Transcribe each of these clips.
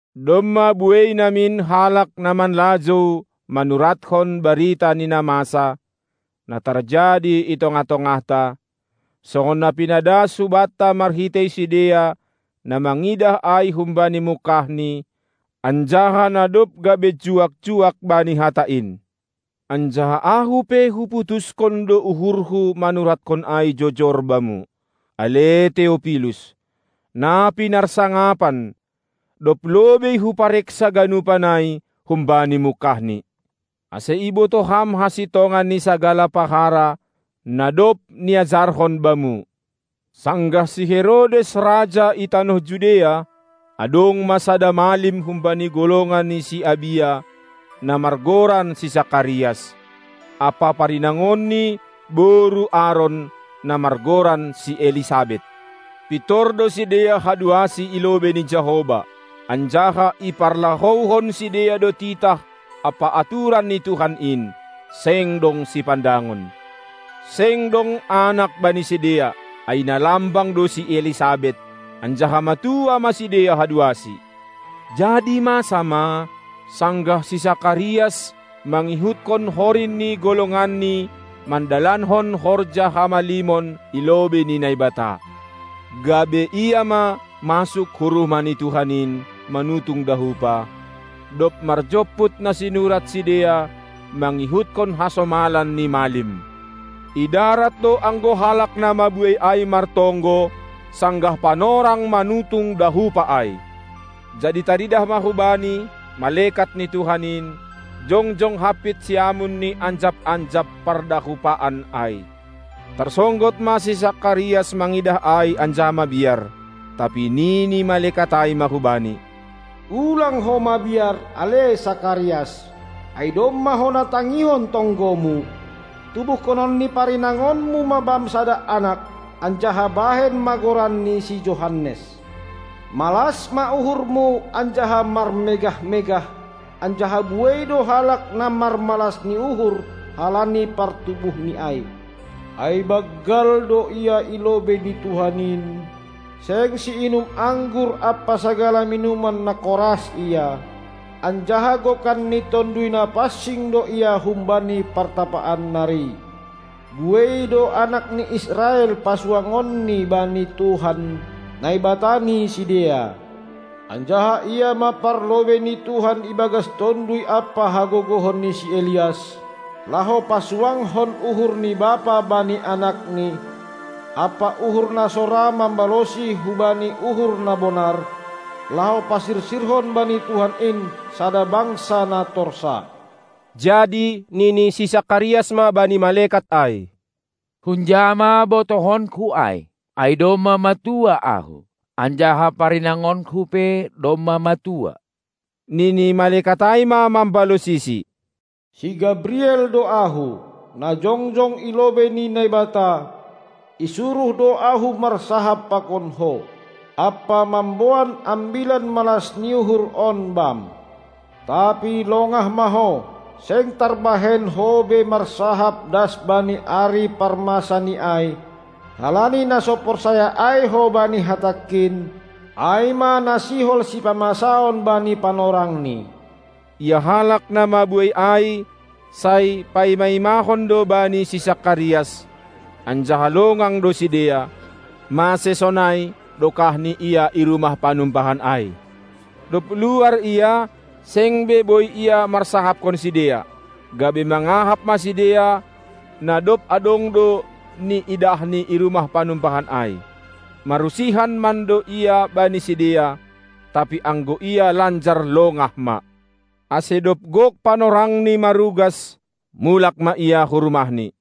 Domma buei namin halak na manlajou manuratkon barita ni na masa, na tarjadi i tongah-tongahta, songon na pinadas hubanta marhitei sidea na mangidah ai humbani mungkahni, anjaha na dob gabe juak-juak bani Hata in; anjaha ahu pe huputushon do uhurhu manuratkon ai jojor bamu, ale Teopilus, na pinarsangapan, dob lobei hupareksa ganupan ai humbani mungkahni, ase ibotoh ham hasintongan ni sagala pahara, na dob niajarhon bamu. Sanggah si Herodes raja i tanoh Judea, adong ma sada malim humbani golongan ni si Abia, na margoran si Sakarias, ampa parinangonni, boru Aron, na margoran si Elisabet. Pintor do sidea haduasi i lobei ni Jahowa, anjaha iparlahouhon sidea do titah ampa aturan ni Tuhan in, seng dong sipandangon. Seng dong anak bani sidea, ai na lambang do si Elisabet, anjaha matua ma sidea haduasi. Jadi masa ma, sanggah si Sakarias, mangihuthon horin ni golonganni mandalankon horja hamalimon i lobei ni Naibata, gabe ia ma masuk hu rumah ni Tuhan in manutung dahupa, dob marjomput na sinurat sidea mangihuthon hasomalan ni malim. I darat do ango halak na mabuei ai martonggo sanggah panorang manutung dahupa ai. Jadi taridah ma hubani malekat ni Tuhan in, jongjong hampit siamun ni anjap-anjap pardahupaan ai. Tarsonggot ma si Sakarias mangidah ai anjaha mabiar. Tapi nini malekat ai ma hubani: Ulang ho mabiar, ale Sakarias, ai domma hona tangihon tonggomu; tubuhkonon ni parinangonmu ma bam sada anak, anjaha bahen ma goranni si Johannes. Malas ma uhurmu anjaha marmegah-megah, anjaha buei do halak na marmalas ni uhur halani partubuhni ai. Ai banggal do ia i lobei ni Tuhan in. Seng siinum anggur ampa sagala minuman na koras ia, anjaha gokan ni Tonduy Napansing do ia humbani partapaan nari. Buei do anak ni Israel pasuangonni bani Tuhan, Naibata ni sidea. Anjaha ia ma parlobei ni Tuhan ibagas tonduy ampa hagogohon ni si Elias, laho pasuangkon uhur ni bapa bani anakni, ampa uhur na so ra mambalosi hubani uhur na bonar, laho pasirsirhon bani Tuhan in sada bangsa na torsa. Jadi nini si Sakarias ma bani malekat ai: Hunja ma botohonku ai? Ai domma matua ahu, anjaha parinangonku pe domma matua. Nini malekat ai ma mambalosisi: Si Gabriel do ahu, na jongjong i lobei ni Naibata, isuruh do ahu marsahap pakon ho, ampa mamboan ambilan malas ni uhur on bam. Tapi longah ma ho, seng tarbahen ho be marsahap das bani ari parmasa ni ai, halani na so porsaya ai ho bani hatangkin, ai ma na sihol sipamasaon bani panorangni. Ia halak na mabuei ai, sai paima-imahon do bani si Sakarias, anjaha longang do sidea, mase sonai dokahni ia i rumah panumbahan ai. Dob luar ia, seng be boi ia marsahapkon sidea, gabe mangahap ma sidea, na dob adong do niidahni i rumah panumbahan ai. Marusihan mando ia bani sidea, tapi anggo ia lanjar longah ma. Ase dob gok panorangni marugas, mulak ma ia hu rumahni.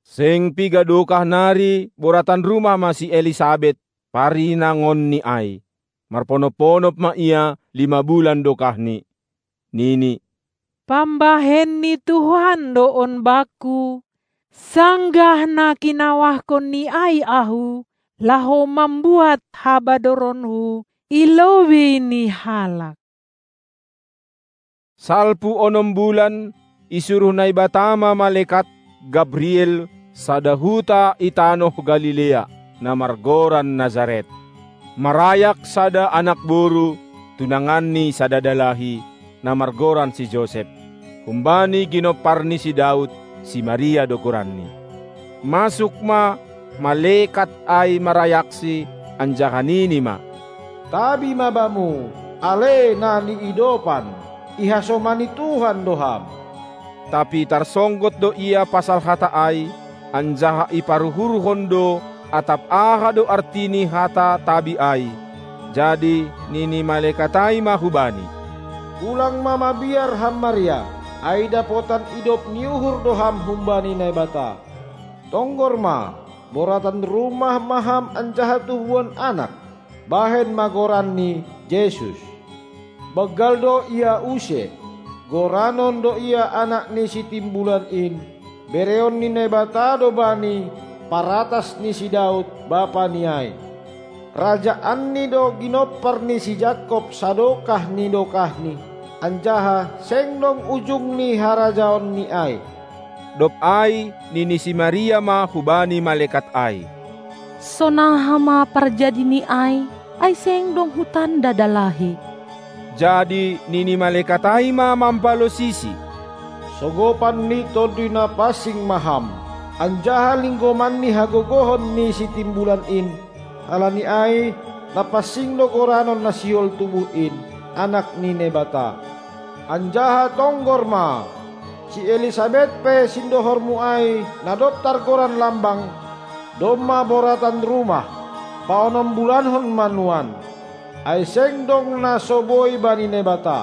Seng piga dokah nari boratan rumah ma si Elisabet, parinangonni ai; marponop-ponop ma ia lima bulan dokahni. Nini: Pambahen ni Tuhan do on bakku, sanggah na kinawahkonNi ai ahu, laho mambuat habadoronku i lobei ni halak. Salpu onom bulan isuruh Naibata ma malekat Gabriel hu sada huta i tanoh Galilea, na margoran Nasaret, marayak sada anak-boru, tunangan ni sada dalahi, na margoran si Josep, humbani ginompar ni si Daud; si Maria do goranni. Masuk ma malekat ai marayaksi, anjaha nini ma: Tabi ma bamu, ale na niidopan! Ihasomani Tuhan do ham! Tapi tarsonggot do ia pasal hata ai, anjaha iparuhurhon do, atap aha do arti ni hata tabi ai. Jadi nini malekat ai ma hubani: Ulang ma mabiar ham Maria, ai dapotan idop ni uhur do ham humbani Naibata. Tonggor ma, boratan rumah ma ham anjaha tubuhan anak; bahen ma goranNi Jesus. Banggal do Ia use, goranon do Ia Anak ni Sitimbulan in; bereon ni Naibata do Bani paratas ni si Daud, bapaNi ai. RajaanNi do ginompar ni si Jakob sadokah ni dokahni, anjaha seng dong ujung ni harajaonNi ai. Dob ai nini si Maria ma hubani malekat ai: Sonaha ma parjadi ni ai, ai seng dong hutanda dalahi? Jadi nini malekat ai ma mambalosisi: Sogopan ni Tonduy Napansing ma ham, anjaha linggoman ni hagogohon ni Sitimbulan in; halani ai: Napansing do goranon na sihol tubuh in, Anak ni Naibata. Anjaha tonggor ma, si Elisabet pe, sindohormu ai, na dob targoran lambang, domma boratan rumah, paonom bulankon ma nuan. Ai seng dong na so boi bani Naibata.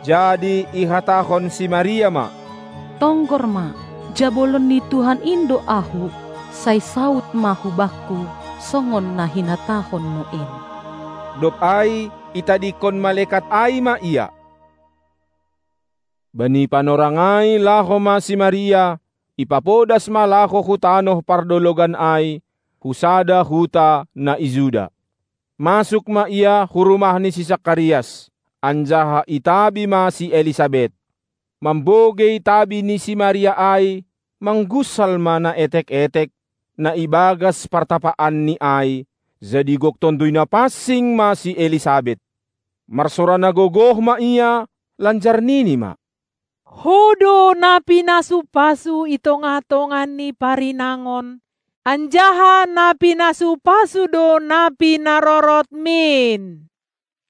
Jadi ihatahon si Maria ma: Tonggor ma, jabolon ni Tuhan in do ahu. Sai saud ma hubakku songon na hinatahonmu in! Dob ai itadingkon malekat ai ma ia. Bani panorang ai laho ma si Maria, ipapodas ma laho hu tanoh pardologan ai, hu sada huta na i Juda. Masuk ma ia hu rumah ni si Sakarias, anjaha itabi ma si Elisabet. Mambogei tabi ni si Maria ai mangunsal ma na etek-etek, na ibagas partapaanni ai, jadi gok Tonduy Napansing ma si Elisabet. Marsora na gogoh ma ia, lanjar nini ma: Ho do na pinasu-pasu i tongah-tongah ni parinangon, anjaha na pinasu-pasu do na pinarorotmin.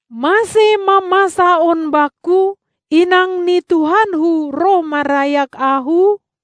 Mase ma masa on bakku, inang ni Tuhanku roh marayak ahu?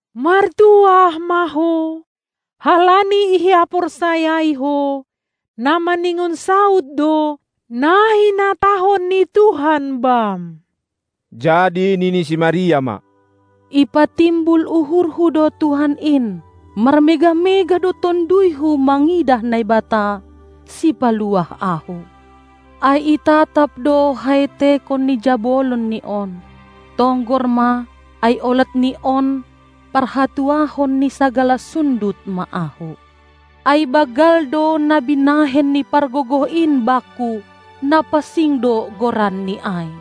Martuah ma ho, halani ihaporsayai ho, na maningon saud do na hinatahon ni Tuhan bam! Jadi nini si Maria ma: Ipatimbul uhurhu do Tuhan in! Marmegah-megah do tonduyhu mangidah Naibata, Sipaluah ahu. Ai itatap do haetekon ni jabolonNi on. Tonggor ma, ai olat ni on parhatuahon ni sagala sundut ma ahu. Ai banggal do na binahen ni Pargogoh in bakku. Napansing do goranNi ai.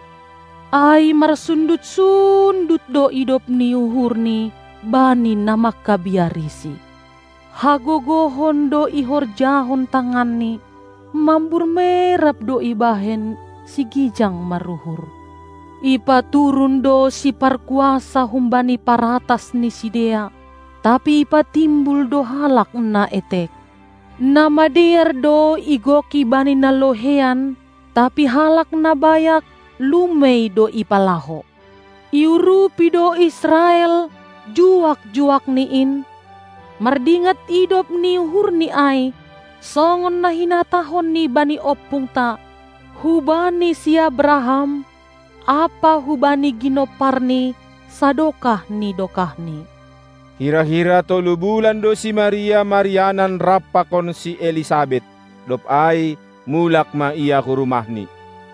Ai marsundut-sundut do idop ni uhurNi bani na mangkabiariSi. Hagogohon do ihorjahon tanganNi; mambur merab do ibahen sigijang maruhur. Ipaturun do siparkuasa humbani paratas ni sidea, tapi ipatimbul do halak na etek. Na madear do igoki bani na loheian, tapi halak na bayak lumei do ipalaho. Iurupi do Israel, juak-juakni in, mardingat idop ni uhurni ai, songon na hinatahonni bani ompungta, hubani si Abraham ampa hubani ginomparni sadokah ni dokahni. Hira-hira tolu bulan do si Maria marianan rap pakon si Elisabet, dob ai mulak ma ia hu rumahni.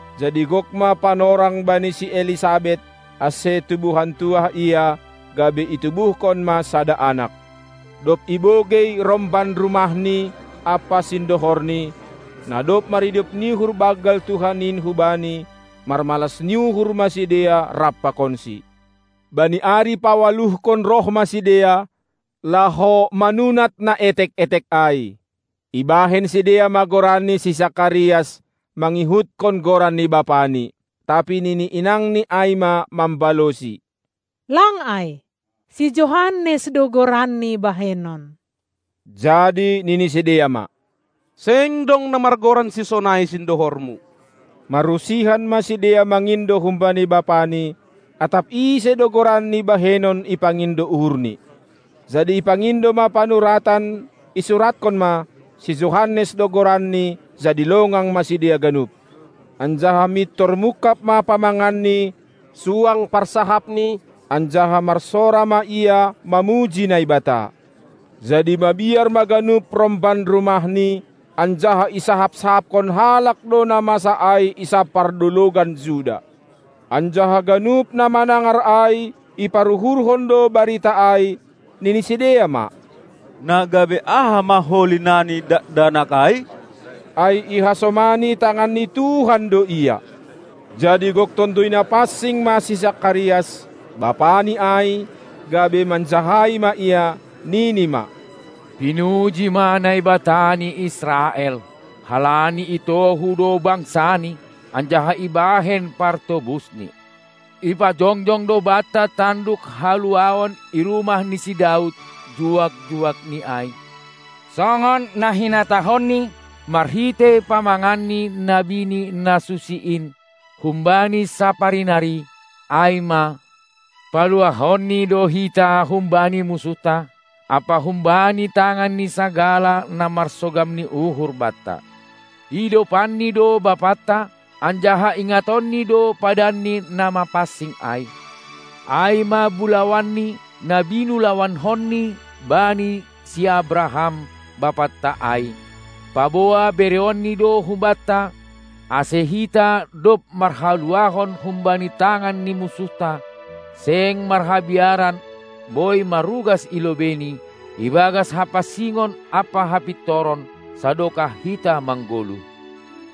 Jadi gok ma panorang bani si Elisabet, ase tubuhan tuah ia, gabe itubuhkon ma sada anak. Dob ibogei romban rumahni ampa sindohorni, na dob maridop ni uhur banggal Tuhan in hubani, marmalas ni uhur ma sidea rap pakonsi. Bani ari paualuhkon roh ma sidea, laho manunat na etek-etek ai; ibahen sidea ma goranni si Sakarias mangihutkon goran ni bapani. Tapi nini inangni ai ma mambalosi: Lang ai, si Johannes do goranni bahenon! Jadi nini sidea ma: Seng dong na margoran sisonai sindohormu! Marusihan ma sidea mangindo humbani bapani, atap ise do goranni bahenon ipangindo uhurni. Jadi ipangindo ma panuratan, isuratkon ma: Si Johannes do goranni! Jadi longang ma sidea ganup. Anjaha mintor mungkab ma pamanganni, suang parsahapni, anjaha marsora ma ia mamuji Naibata. Jadi mabiar ma ganup romban rumahni, anjaha isahap-sahapkon halak do na masa ai i sab pardologan Juda. Anjaha ganup na manangar ai iparuhurhon do barita ai, nini sidea ma: Na gabe aha ma holi nani dakdanak ai? Ai ihasomani tangan ni Tuhan do ia. Jadi gok Tonduy Napansing ma si Sakarias, bapani ai, gabe manjahai ma ia, nini ma: Pinuji ma Naibata ni Israel, halani itohu do bangsaNi anjaha ibahen partobusni. Ipajongjong do banta tanduk haluahon i rumah ni si Daud, juak-juakNi ai, songon na hinatahonNi marhitei pamangan ni nabini na susi in humbani sapari nari, ai ma: PaluahonNi do hita humbani munsuhta, ampa humbani tangan ni sagala na marsogam ni uhur banta; idopanNi do bapanta, anjaha ingatonNi do padanni na mapansing ai. Ai ma bulawanNi, na binulawanhonni bani si Abraham, bapanta ai, paboa bereonNi do hubanta, ase hita, dob marhaluahon humbani tangan ni munsuhta, seng marhabiaran boi marugas i lobeiNi. ibagas hapansingon ampa hapintoron, sadokah hita manggoluh.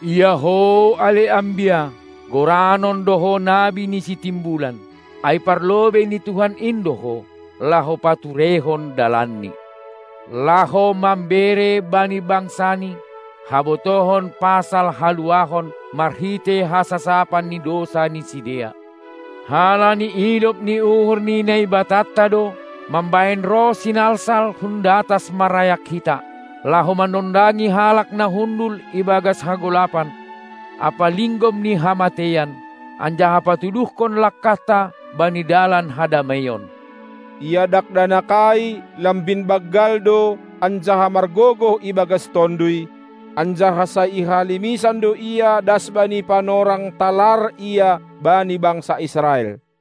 Ia ho, ale ambia, goranon do ho nabi ni Sitimbulan, ai parlobei ni Tuhan in do ho, laho patureihon dalanNi, laho mambere bani bangsaNi habotohon pasal haluahon marhitei hasasapan ni dousa ni sidea, halani idop ni uhur ni Naibatanta do mambahen roh sinalsal hun datas marayak hita, laho manondangi halak na hundul ibagas hagolapan ampa linggom ni hamateian, anjaha patuduhkon langkahta bani dalan hadameion. Ia dakdanak ai lambin banggal do anjaha margogoh ibagas tonduy; anjaha sai i halimisan do ia das bani panorang talar ia bani bangsa Israel.